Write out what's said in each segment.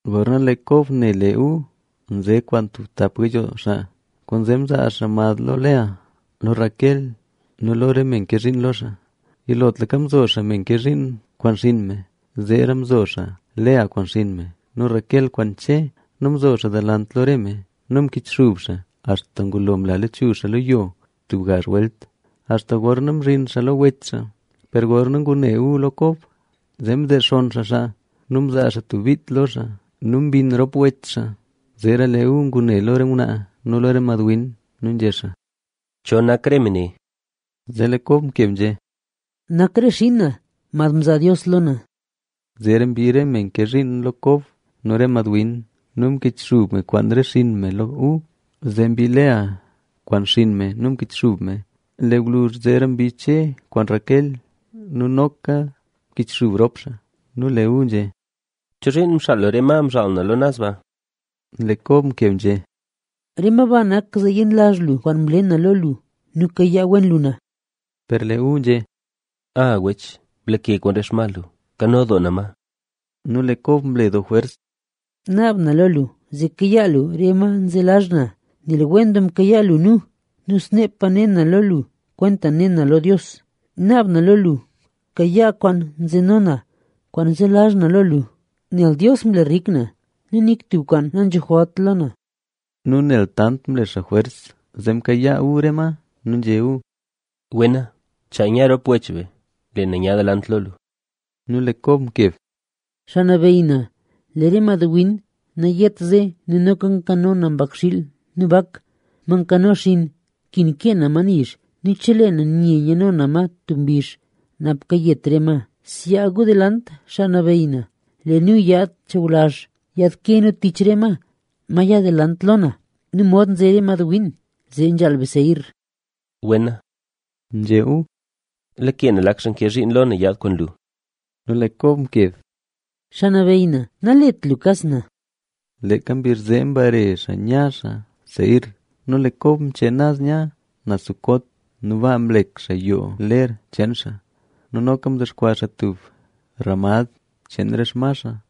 Gorna lee Kob ne lee Esaú nze kwaan tub tap gayoo xaa, kwaanzee mzaa xaa mad lo Lea, lo Raquel nu lo re me nke zhiin lo xaa. Yilotlaka mzo xaa me nke zhiin kwaan xinn me, zeera mzo xaa Lea kwaan xinn me nu Raquel kwaan Che. Nu mzo xaa delant lo re me nu mkichxub xaa axta ngulo mla lachuzh xaa lo yo tub gazh welt, axta gorna mzhin xaa lo wech xaa. Per gorna ngune Esaú lo Kob, zee mdexonn xaa xaa nu mzaa xaa tub bit lo xaa nu mbinn rop wech xaa. Zeera lee Esaú ngune lo re ngwnaa nu lo re mad win nu nzhé xaa: —¿Cho nak re me ne? Zee lee Kob mkeb nzhé: —Nak re xiin na, mad mzaa Dios lo na. Zeera mbii re me nke zhiin lo Kob nu re madwin nu mkichxub me kwaan re xinn me lo Esaú. Zee mbii Lea kwaan xinn me nu mkichxub me, lee gwluzh zeera mbii Che kwaan Raquel nu noka mkichxub rop xaa. Nu lee Esaú nzhé: —¿Chozhiin mxaal lu re ma mzhaal na lo naz baa? Lee Kob mkeb nzhé: —Re ma ba nak zee yenlazh lu kwaan mle na lo lu nu kayaa wen lu na. Per lee Esaú nzhé: —A wech, blake kwaan re xma lu; nkano doo na ma. Nu lee Kob mle doo jwers: —Naab na lo lu, zee kayaa lu re ma zelazh na, nel wen doo mkayaa lu nu nu sneepa ne na lo lu kwentaxa ne na lo Dios. Naab na lo lu, bkayaa kwaan nzeno na kwaan zelazh na lo lu, nel Dios mle rik na nu nik tub kwaan nanzho jwalt lo na. Nu nel tant mle xaa jwers, zee mkayaa Esaú re ma. Nu nzhé Esaú: —Wena. Chaa nya rop wech be, lee na nya delant lo lu. Nu lee Kob mkeb: —Xaa nabeyy na, lee re madwin nayet ze nu noka nkano na mbakxiil nu bak, ma nkano xinn nkin kee na ma nizh nu chelee na nye nyano na ma tub mbizh napa kayet re ma. Zyaa gu delant, xaa nabeyy na. Lee nu yaad chawlazh, yaadke nu tich re ma, ma ya delant lo na nu mod nze re madwin, zee nzhaal be Seir. —Wena —nzhé Esaú—. Lake na lak xaa nke zhiin lo na yaad kwaan lu. Nu lee Kob mkeb: —Xaa nabeyy na, nalet lu kas na. Leeka mbizh zee mbare xaa nya xaa Seir. Nu lee Kob mchee naz nya naz Sucot. Nu baa mlek xaa tub yoo ler cheen xaa nu noka mdexkwaa xaa tub ramad cheen re xma xaa.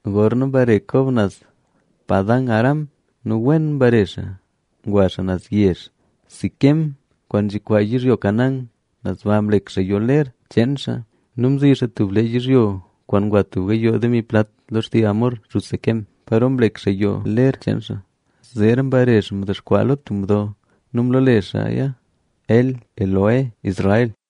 Gorna mbare Kob naz Padan-aram nu wen mbare xaa. Ngwa xaa naz yezh Siquem kwaan nzhikwaa yizhyo Canaán. Naz ba mlek xaa yoo ler xcheen xaa. Nu mzi xaa tub lee yizhyo kwaan ngwa tub gayoo demi plat lo xtii Hamor, xuz Siquem, paro mlek xaa yoo ler. Zeera mbare xaa mdexkwaa xaa lo tub mdo nu mloole xaaya El-Elohe-Israel.b